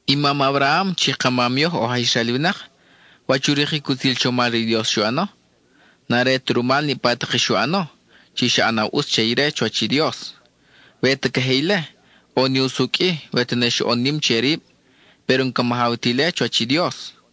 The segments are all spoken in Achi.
I mam Abraham chi ka mam yoj oj aj Israel winak, ¿wach u rikic utzil chomal re i Dios xu ʼano? N-are ta rumal niʼpa tak i xu ʼano chi xa ʼanaw ʼutz che ire chuwach i Dios. We ta queje ile, ʼo ne usucʼ-i we tene xoʼon nim che rib, péro n-ca majaw ta ile chuwach i Dios.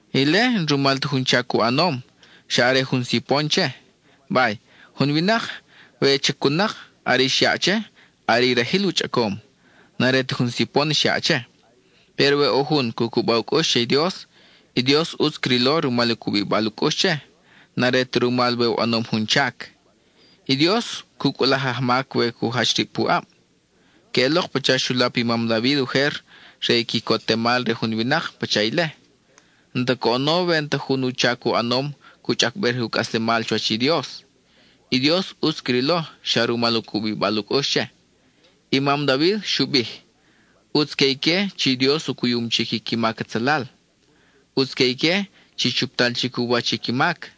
(Ile n-rumal ta jun chac u ʼanom; xa are jun sipon che.) Bay, jun winak, we chacun-nak, are i xyaʼ che, are i rajil u chʼacom; n-are ta jun sipon xyaʼ che. Péro we ʼo jun cu cuba u cʼux che i Dios, i Dios ʼutz crilo rumal u cubibal u cʼux che; n-are ta rumal we u ʼanom jun chac. I Dios cu cʼulaj i ajmac we cu jach rib puʼab. Queʼelok pacha xu lap i mam David ujer re i quicotemal re jun winak pacha ile. N-ta coʼono we n-ta jun chac u ʼanom cu chʼacbej re u cʼaslemal chuwach i Dios; i Dios ʼutz crilo xa rumal u cubibal u cʼux che. I mam David xu bij: ʼUtz que ique chi Dios u cuyum chic i qui mac atzalal, ʼutz que ique chi chuptal chic u wach i qui mac.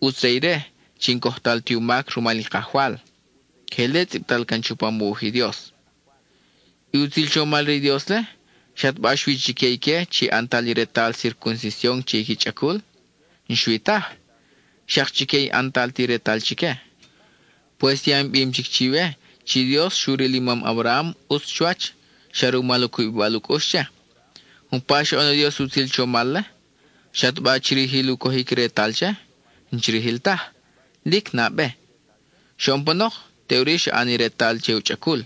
ʼUtz re ire chi n-cojtal ti u mac rumal i Kajwal. (Queje ile tzʼibtal can chupam u wuj i Dios.) I utzil chomal re i Dios-le ¿xataba xui chique ique chi ʼantal i retal circuncision che i qui chʼacul? N-xui taj. Xak chique i n-ʼantal ti retal chique. Pues ya in bim chic chiwe chi Dios xu ril i mam Abraham ʼutz chuwach, xa rumal u cubibal u cʼux che. ¿Umpa xoʼon i Dios i utzil chomal-le? ¿Xataba chirijil u cojic i retal che? N-chirijil taj; lic nabe. Xoʼon panok, teʼuri xa ʼan i retal che u chʼacul.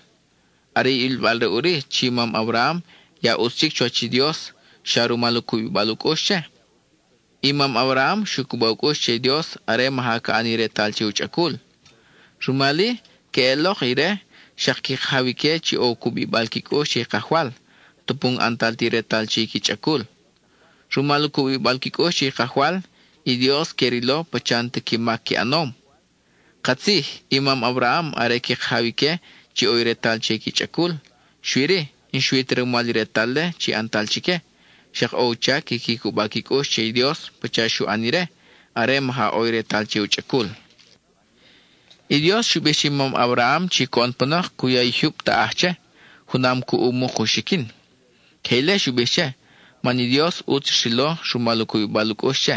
Are i ʼilbal-re ʼuri chi i mam Abraham ya ʼutz chic chuwach i Dios xa rumal u cubibal u cʼux che. I mam Abraham xu cuba u cʼux che i Dios are maja ca ʼan i retal che u chʼacul. Rumal-i, queʼelok ire xak qui kajaw ique chi ʼo u cubibal qui cʼux che i Kajwal, tupu n-ʼantal ti retal che i qui chʼacul. Rumal u cubibal qui cʼux che i Kajwal, i Dios que rilo pacha n-ta qui mac qui ʼanom. Katzij, i mam Abraham are qui kajaw ique chi ʼo i retal che qui chʼacul, xui-ri, n-xui ta rumal i retal-le, chi ʼantal chique, xak ʼo u chac quiqui cuba qui cʼux che i Dios pacha xu ʼan ire are maja ʼo i retal che u chʼacul. I Dios xu bij che i mam Abraham chi coʼon panok cu ya i jyub taʼaj che, junam cuʼ u muk u xiquin. Queje ile xu bij che, man i Dios ʼutz xrilo rumal u cubibal u cʼux che.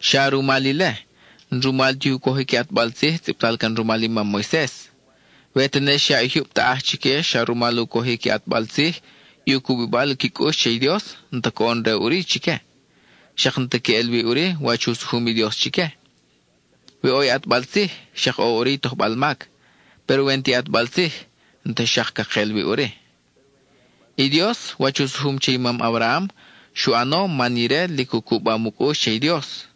Xa rumal ile; n-rumal ti u cojic i ʼatbal tzij tzʼibtal can rumal i mam Moises. We tene xyaʼ i jyub taʼaj chique xa rumal u cojic i ʼatbal tzij, i u cubibal qui cʼux che i Dios n-ta coʼon-re ʼuri chique, xak n-ta queʼel wi ʼuri wach u sujum i Dios chique. We ʼo i ʼatbal tzij, xak ʼo ʼuri i tojbal mac; péro we n-ti ʼatbal tzij, n-ta xak ca kel wi ʼuri. I Dios, wach u sujum che i mam Abraham, xu ʼano man ire lic u cubam u cʼux che i Dios.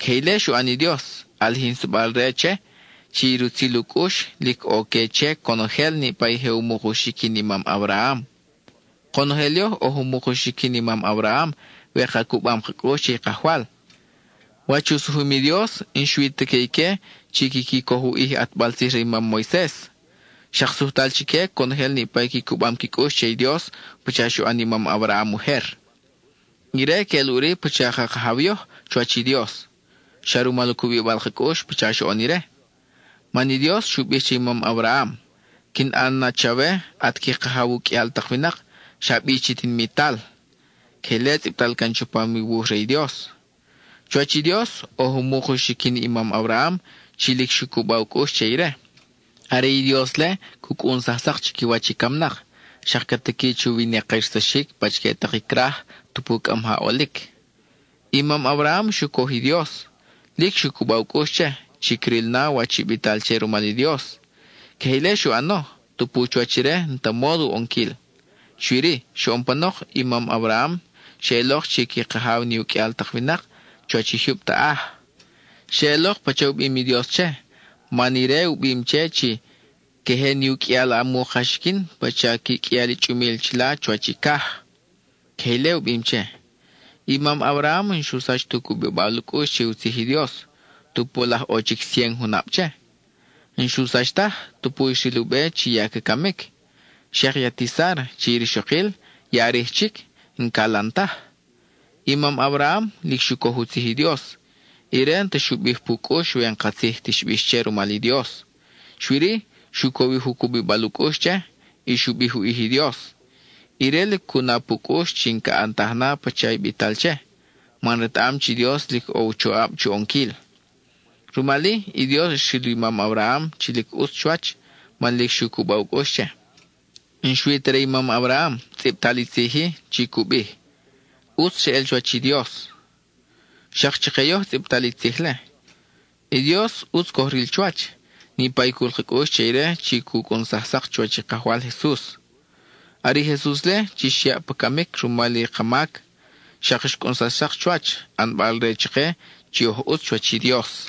Queje ile xu ʼan i Dios, ʼalijinsabal-re che, chi i rutzil u cʼux, lic ʼo que che conojel niʼpa i je u muk u xiquin i mam Abraham. Konojel yoj oj u muk u xiquin i mam Abraham we ka cubam ka cʼux che i Kajwal. Wach u sujum i Dios, n-xui ta que ique chi quiqui coj u ʼij i ʼatbal tzij re i mam Moises, xak sujtal chique conojel niʼpa i qui cubam qui cʼux che i Dios pacha xu ʼan i mam Abraham ujer. Ire queʼel ʼuri pacha ka kajaw yoj chuwach i Dios, xa rumal u cubibal ka cʼux pacha xoʼon ire. Man i Dios xu bij che i mam Abraham: “Quin ʼan na chawe at qui kajaw u qʼuial tak winak, xa bi chi tinimital.” Queje ile tzʼibtal can chupam i wuj re i Dios. Chuwach i Dios, oj u muk u xiquin i mam Abraham, chi lic xu cuba u cʼux che ire. Are i Dios-le cu cʼunsaj sak chiquiwach i camnak, xak ca tiqui chu wina-kirsaxic pachique tak i craj, tupu cʼa maja ʼolic. I mam Abraham xu coj i Dios; lic xu cuba u cʼux che, chi cril na wach i bital che rumal i Dios. Queje ile xu ʼano, tupu chuwach ire n-ta módo u ʼonquil. Xui-ri, xoʼon panok i mam Abraham xeʼelok chi qui kajaw ni u qʼuial tak winak, chuwach i jyub taʼaj. Xeʼelok pacha u bim i Dios che, man Ire u bim che chi “Queje ni u qʼuial a muk a xiquin pacha qui qʼuial i chʼumil chila chuwach i caj.” Queje ile u bim che. I mam Abraham n-xu sach tu cubibal u cʼux che u tzij i Dios, tupu laj ʼo chic cien junab che. N-xu sach taj, tupu xril u be chi ya ca camic; xak i ati Sára, chi rixokil, ya rij chic, n-calan taj. I mam Abraham, lic xu coj u tzij i Dios, ire n-ta xu bij pu cʼux we n-katzij ti xbix che rumal i Dios. Xui-ri, xu cowij u cubibal u cʼux che, y xu bij u ʼij i Dios. Ire lic cu na pu cʼux chi ca ʼantaj na pacha i bital che, man retaʼam chi Dios lic ʼo u choʼab chu ʼonquil. Rumal-i, i Dios xril i mam Abraham lic ʼutz chuwach, man lic xu cuba u cʼux che. N-xui ta re i mam Abraham, tzʼibtal i tzij-i chi cu bij: “ʼUtz xeʼel chuwach i Dios.” Xak chake yoj tzʼibtal i tzij-le. I Dios ʼutz coj ril chuwach, niʼpa i cul ka cʼux che ire chi xu cʼunsaj sak chuwach i Kajwal Jesus. Are i Jesus-le chi xyaʼ pa camic rumal i ka mac, xak xcʼunsax sak chuwach, ʼanbal re chake chi oj ʼutz chuwach i Dios.